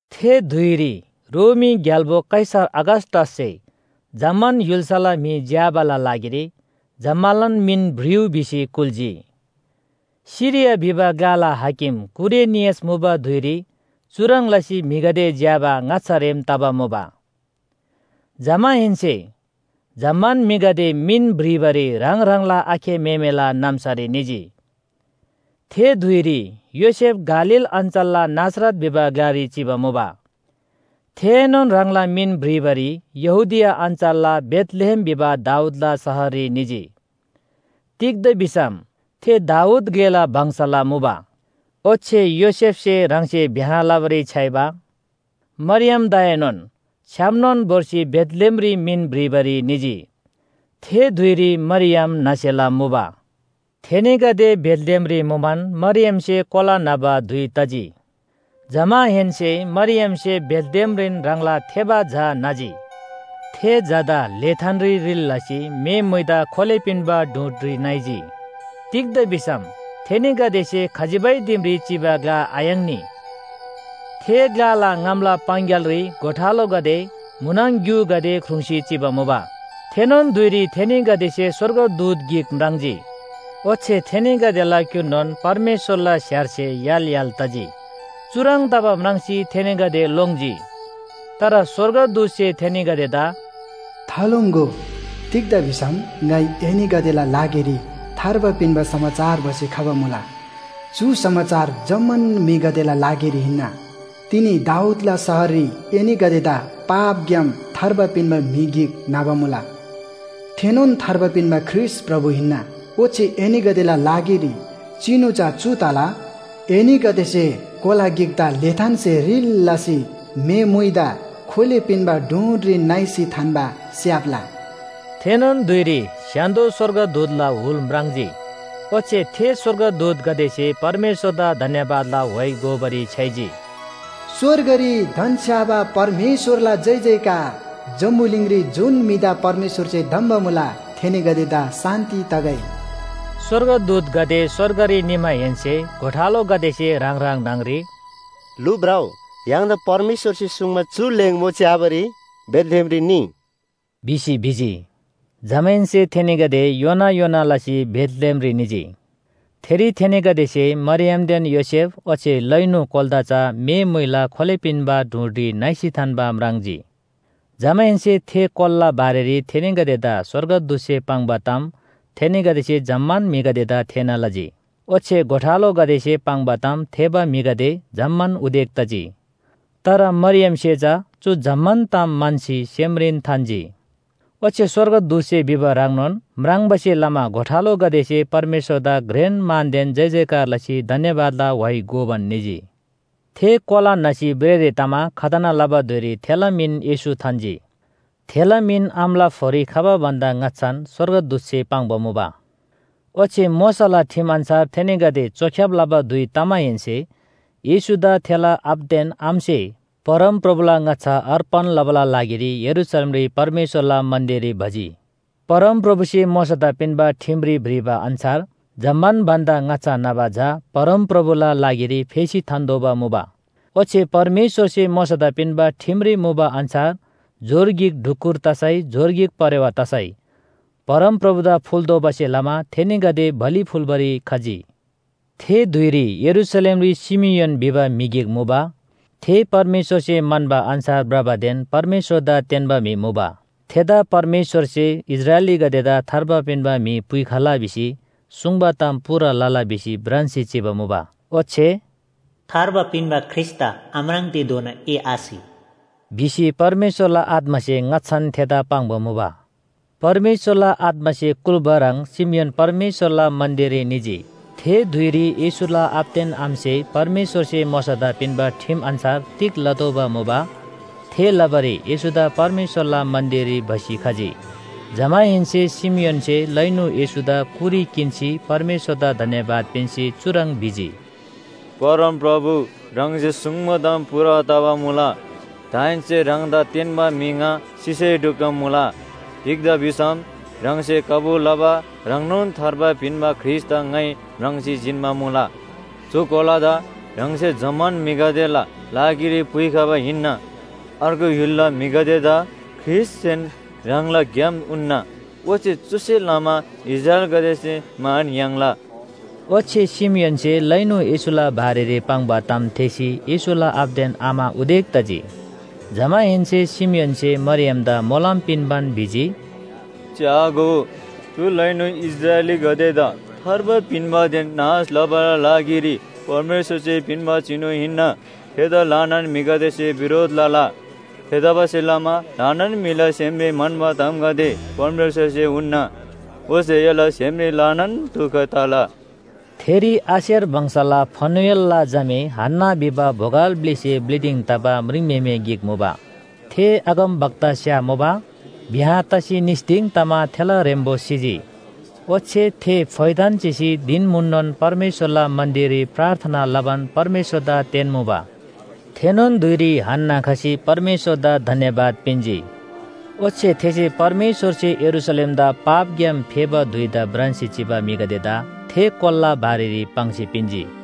थे धुइरी रोमी ग्‍याल्‍बो कैसर अगस्‍टससे जम्‍मान य्‍हुल्‍साला म्‍हि झ्‍याबाला लागिरी जम्‍मालान मिन भ्रिउ भिसी कुल्‍जी। सिरिया भिबा ग्‍लाला हाकिम कुरेनियस मुबा धुइरी चुह्रङ् लसी म्‍हिगदे झ्‍याबा ङाच्‍छा रेम तबा मुबा। जमाहेन्‍से जम्‍मान म्‍हिगदे मिन भ्रिबारी ह्राङ ह्राङला आखे म्‍हेमेला नाम्‍सारी निजी। थे धुइरी योसेफ गालील अञ्‍चलला नासरत भिबा ग्‍लारी चिबा मुबा। थेएनोन ह्राङला मिन भ्रिबारी यहूदिया अञ्‍चलला बेथलेहेम भिबा दाऊदला शहररी निजी। तिग्‍दा भिसम थे दाऊद ग्‍लेला वंशला मुबा। ओच्‍छे योसेफसे ह्राङसे ब्‍याह लबारी छ्‌याइबा मरियमदाएनोन छ्‌यामनोन भोर्सी बेथलेहेमरी मिन भ्रिबारी निजी। थे धुइरी मरियम न्‍हसेला मुबा। थेनीगदे बेथलेहेमरी मुमान मरियमसे कोला न्‍हबा धुइ तजी। जमाहेन्‍से मरियमसे बेथलेहेमरीन ह्राङला थेबा झा न्‍हजी। थे झादा ल्‍हेथानरी रिल लसी म्‍हे मुइदा खोले पिन्‍बा डूँडरी नाइजी। तिग्‍दा भिसम थेनीगदेसे खजिबै दिमरी चिबा ग्‍ला आयाङ्नी। थे ग्‍लाला ङामला पाङग्‍यालरी गोठालोगदे म्‍हुनङ ग्‍युगदे ख्रुङ्‌सी चिबा मुबा। थेनोन धुइरी थेनीगदेसे स्‍वर्गदूत गिक म्राङ्जी। ओच्‍छे थेनीगदेला क्‍युर्नोन परमेश्‍वरला स्‍हेरसे य्‍हाल य्‍हाल तजी। चुह्रङ् तबा म्राङ्सी थेनीगदे लोङ्जी। तर स्‍वर्गदूतसे थेनीगदेदा “थालोङ्‍गो! तिग्‍दा भिसम ङाइ एनीगदेला लागिरी थार्बा पिन्‍बा समाचार भसी खबा मुला। चु समाचार जम्‍मान म्‍हिगदेला लागिरी हिन्‍ना। तिनी दाऊदला शहररी एनीगदेदा पापग्‍याम थार्बा पिन्‍बा म्‍हि गिक न्‍हबा मुला। थेनोन थार्बा पिन्‍बा ख्रीष्‍ट प्रभु हिन्‍ना। ओच्‍छे एनीगदेला लागिरी चिनु चा चु तला, एनीगदेसे कोला गिकदा ल्‍हेथानसे रिल लसी म्‍हे मुइदा खोले पिन्‍बा डूँडरी नाइसी थान्‍बा स्‍याप्‍ला।” थेनोन धुइरी स्‍य्‍हान्‍दो स्‍वर्गदूतला हुल म्राङ्जी। ओच्‍छे थे स्‍वर्गदूतगदेसे परमेश्‍वरदा धन्‍यवादला व्‍हाइ गोबारी छ्‌याइजी, “स्‍वर्गरी धन्‍छ्‌याबा परमेश्‍वरला जयजयकार, जम्‍बुलिङरी जुन म्‍हिदा परमेश्‍वरसे धम्‍बा मुला थेनीगदेदा शान्‍ति तगै!” स्‍वर्गदूतगदे स्‍वर्गरी निमाहेन्‍से गोठालोगदेसे ह्राङ ह्राङ न्‍हङरी “लु, भ्रउ, य्‍हाङदा परमेश्‍वरसे सुङ्बा चु ल्‍हेङमो च्‍याबारी बेथलेहेमरी निइ” भिसी भिजी। जमाहेन्‍से थेनीगदे योना योना लसी बेथलेहेमरी निजी। थेरी थेनीगदेसे मरियमदेन योसेफ ओच्‍छे लैनु कोलादा चा म्‍हे मुइदा खोले पिन्‍बा डूँडरी नाइसी थान्‍बा म्राङ्जी। जमाहेन्‍से थे कोलाला बारेरी थेनीगदेदा स्‍वर्गदूतसे पाङ्बा ताम थेनीगदेसे जम्‍मान म्‍हिगदेदा थेःना लजी। ओच्‍छे गोठालोगदेसे पाङ्बा ताम थेःबा म्‍हिगदे जम्‍मान उदेक तजी। तर मरियमसे चा चु जम्‍मान ताम म्‍हन्‍सी सेमरीन थान्‍जी। ओच्‍छे स्‍वर्गदूतसे भिबा ह्रङ्नोन म्राङ्बासे लमा गोठालोगदेसे परमेश्‍वरदा घ्रेन मानदेन जयजयकार लसी धन्‍यवादला व्‍हाइ गोबान निजी। थे कोला न्‍हसी भ्रेःरे तमा खतना लबा धुइरी थेला मिन येशू थान्‍जी। थेला मिन आमाला फोरी खबा भन्‍दा ङाच्‍छान स्‍वर्गदूतसे पाङ्बा मुबा। ओच्‍छे मोशाला ठिम अन्‍छार थेनीगदे चोख्‍याब लबा धुइ तमाहेन्‍से येशूदा थेला आबादेन आमासे परमप्रभुला ङाच्‍छा अर्पण लबाला लागिरी यरूशलेमरी परमेश्‍वरला मन्‍दिररी भजी। परमप्रभुसे मोशादा पिन्‍बा ठिमरी भ्रिबा अन्‍छार जम्‍मान भन्‍दा ङाच्‍छा न्‍हबा झा परमप्रभुला लागिरी फेसी थान्‍तोःबा मुबा। ओच्‍छे परमेश्‍वरसे मोशादा पिन्‍बा ठिमरी मुबा अन्‍छार जोर गिक ढुकुर तसै जोर गिक परेवा तसै परमप्रभुदा फुल्‍तोःबासे लमा थेनीगदे बलि फुल्‍बारी खजी। थे धुइरी यरूशलेमरी शिमियोन भिबा म्‍हि गिक मुबा। थे परमेश्‍वरसे म्‍हन्‍बा अन्‍छार भ्रबादेन परमेश्‍वरदा तेन्‍बा म्‍हि मुबा। थेदा परमेश्‍वरसे इस्राएलीगदेदा थार्बा पिन्‍बा म्‍हि पुइखला भिसी सुङ्बा ताम पूरा लला भिसी भ्रान्‍सी चिबा मुबा। ओच्‍छे “थार्बा पिन्‍बा ख्रीष्‍टदा आम्राङ्तेधोना ए आसि” भिसी परमेश्‍वरला आत्‍मासे ङाच्‍छान थेदा पाङ्बा मुबा। परमेश्‍वरला आत्‍मासे कुल्‍बा ह्रङ् शिमियोन परमेश्‍वरला मन्‍दिररी निजी। थे धुइरी येशूला आबादेन आमासे परमेश्‍वरसे मोशादा पिन्‍बा ठिम अन्‍छार तिग लतोःबा मुबा, थे लबारी येशूदा परमेश्‍वरला मन्‍दिररी भसी खजी। जमाहेन्‍से शिमियोनसे लैनु येशूदा कुरी किन्‍सी परमेश्‍वरदा धन्‍यवाद पिन्‍सी चुह्रङ् भिजी, “परमप्रभु ह्राङसे सुङ्बा ताम पूरा तबा मुला। दाहेन्‍से ह्राङदा तेन्‍बा म्‍हि ङा सिसै ढुक्‍क मुला। तिग्‍दा भिसम ह्राङसे कबुल लबा ह्रङ्नोन थार्बा पिन्‍बा ख्रीष्‍टदा ङाइ म्राङ्सी जिन्‍बा मुला। चु कोलादा ह्राङसे जम्‍मान म्‍हिगदेला लागिरी पुइखबा हिन्‍ना। अर्गु य्‍हुलला म्‍हिगदेदा ख्रीष्‍टसेन ह्राङला ग्‍याम उन्‍ना, ओच्‍छे चुसे लमा इस्राएलीगदेसे मान याङ्ला।” ओच्‍छे शिमियोनसे लैनु येशूला बारेरी पाङ्बा ताम थेःसी येशूला आबादेन आमा उदेक तजी। जमाहेन्‍से शिमियोनसे मरियमदा मोलम पिन्‍बान भिजी, “च्‍यागो, चु लैनु इस्राएलीगदेदा थार्बा पिन्‍बादेन नाश लबाला लागिरी परमेश्‍वरसे पिन्‍बा चिनु हिन्‍ना। थेदा ल्‍हानान म्‍हिगदेसे बिरोध लला। थेतबासेलमा ल्‍हानान म्‍हिला सेमरी म्‍हन्‍बा तामगदे परमेश्‍वरसे उन्‍ना। ओच्‍छे एला सेमरी ल्‍हानान दुख तला।” थेरी आशेर वंशला फनुएलला झामे हन्‍ना भिबा बोगल ब्‍लिसे ब्‍लि दिङ तबा म्रिङम्‍हेमे गिक मुबा। थे अगमवक्तास्‍या मुबा, ब्‍याह तसी निस दिङ तमा थेला ह्रेम्‍बो सिजी। ओच्‍छे थे फोइथान चिसी धिन म्‍हुननोन परमेश्‍वरला मन्‍दिररी प्रार्थना लबान परमेश्‍वरदा तेन्‍मुबा। थेनोन धुइरी हन्‍ना खसी परमेश्‍वरदा धन्‍यवाद पिन्‍जी। ओच्‍छे थेसे परमेश्‍वरसे यरूशलेमदा पापग्‍याम फेबा धुइदा भ्रान्‍सी चिबा म्‍हिगदेदा थे कोलाला बारेरी पाङ्सी पिन्‍जी।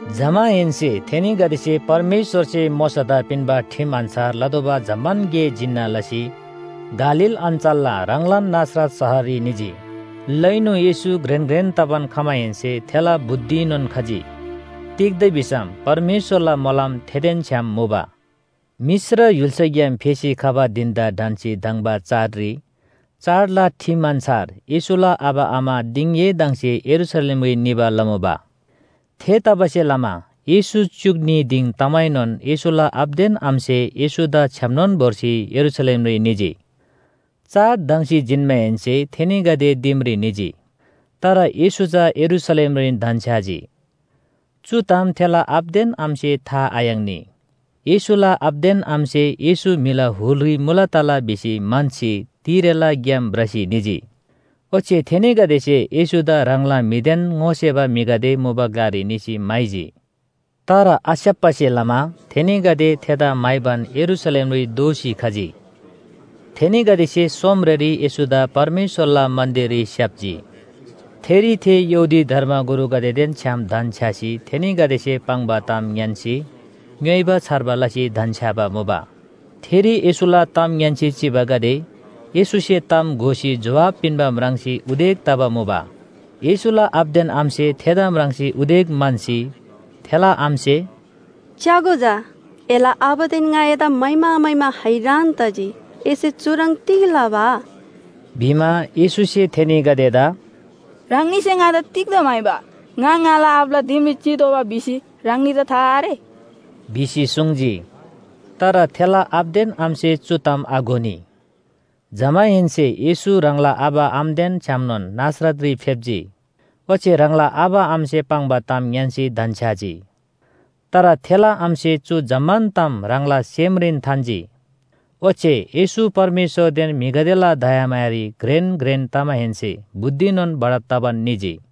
जमाहेन्‍से थेनीगदेसे परमेश्‍वरसे मोशादा पिन्‍बा ठिम अन्‍छार लतोःबा जम्‍मान गे जिन्‍ना लसी गालील अञ्‍चलला ह्राङलान नासरत शहररी निजी। लैनु येशू घ्रेन घ्रेन तबान खमाहेन्‍से थेला बुद्धिएनोन खजी। तिग्‍दा भिसम परमेश्‍वरला मोलम थेदेन छ्‌याम मुबा। मिश्र य्‍हुल्‍साग्‍याम फेसी खबा धिन‍दा ढन्‍सी धङ्बा चाडरी चाडला ठिम अन्‍छार येशूला आबा आमा दिङएदङसे यरूशलेमरी निबा लमुबा। थेतबासेलमा येशू च्‍युक न्‍ही दिङ तमाएनोन येशूला आबादेन आमासे येशूदा छ्‌यामनोन भोर्सी यरूशलेमरी निजी। चाड धङ्‍सी जिन्‍माहेन्‍से थेनीगदे दिमरी निजी। तर येशू चा यरूशलेमरीन धन्‍छ्‌याजी। चु ताम थेला आबादेन आमासे था आयाङ्नी। येशूला आबादेन आमासे येशू म्‍हिला हुलरी मुला तला भिसी म्‍हन्‍सी तिरेला ग्‍याम भ्रसी निजी। ओच्‍छे थेनीगदेसे येशूदा ह्राङला म्‍हिदेन ङोसेबा म्‍हिगदे मुबा ग्‍लारी निसी म्‍हाइजी, तर आस्‍याप्‍बासे लमा थेनीगदे थेदा म्‍हाइबान यरूशलेमरी दोःसी खजी। थेनीगदेसे सोमरेरी येशूदा परमेश्‍वरला मन्‍दिररी स्‍याप्‍जी। थेरी थे यहूदी धर्मगुरुगदेदेन छ्‌याम धन्‍छ्‌यासी थेनीगदेसे पाङ्बा ताम ङ्‌यान्‍सी, ङ्‌योइबा छार्बा लसी धन्‍छ्‌याबा मुबा। थेरी येशूला ताम ङ्‌यान्‍सी चिबागदे येशूसे ताम घोसी जोहाब पिन्‍बा म्राङ्सी उदेक तबा मुबा। येशूला आबादेन आमासे थेदा म्राङ्सी उदेक म्‍हन्‍सी थेला आमासे “च्‍यागो झा, एला आबादेन ङा एदा म्‍हाइमा म्‍हाइमा हैरान तजी, एसे चुह्रङ् तिग लबा?” भिमा, येशूसे थेनीगदेदा “ह्राङनीसे ङादा तिग्‍दा म्‍हाइबा? ङा ङाला आबाला दिमरी चितोःबा भिसी ह्राङनीदा था आरे?” भिसी सुङ्जी। तर थेला आबादेन आमासे चु ताम आघोनी। जमाहेन्‍से येशू ह्राङला आबा आमादेन छ्‌यामनोन नासरतरी फेप्‍जी। ओच्‍छे ह्राङला आबा आमासे पाङ्बा ताम ङ्‌यान्‍सी धन्‍छ्‌याजी। तर थेला आमासे चु जम्‍मान ताम ह्राङला सेमरीन थान्‍जी। ओच्‍छे येशू परमेश्‍वरदेन म्‍हिगदेला दयामायारी घ्रेन घ्रेन तमाहेन्‍से बुद्धिनोन बढब तबान निजी।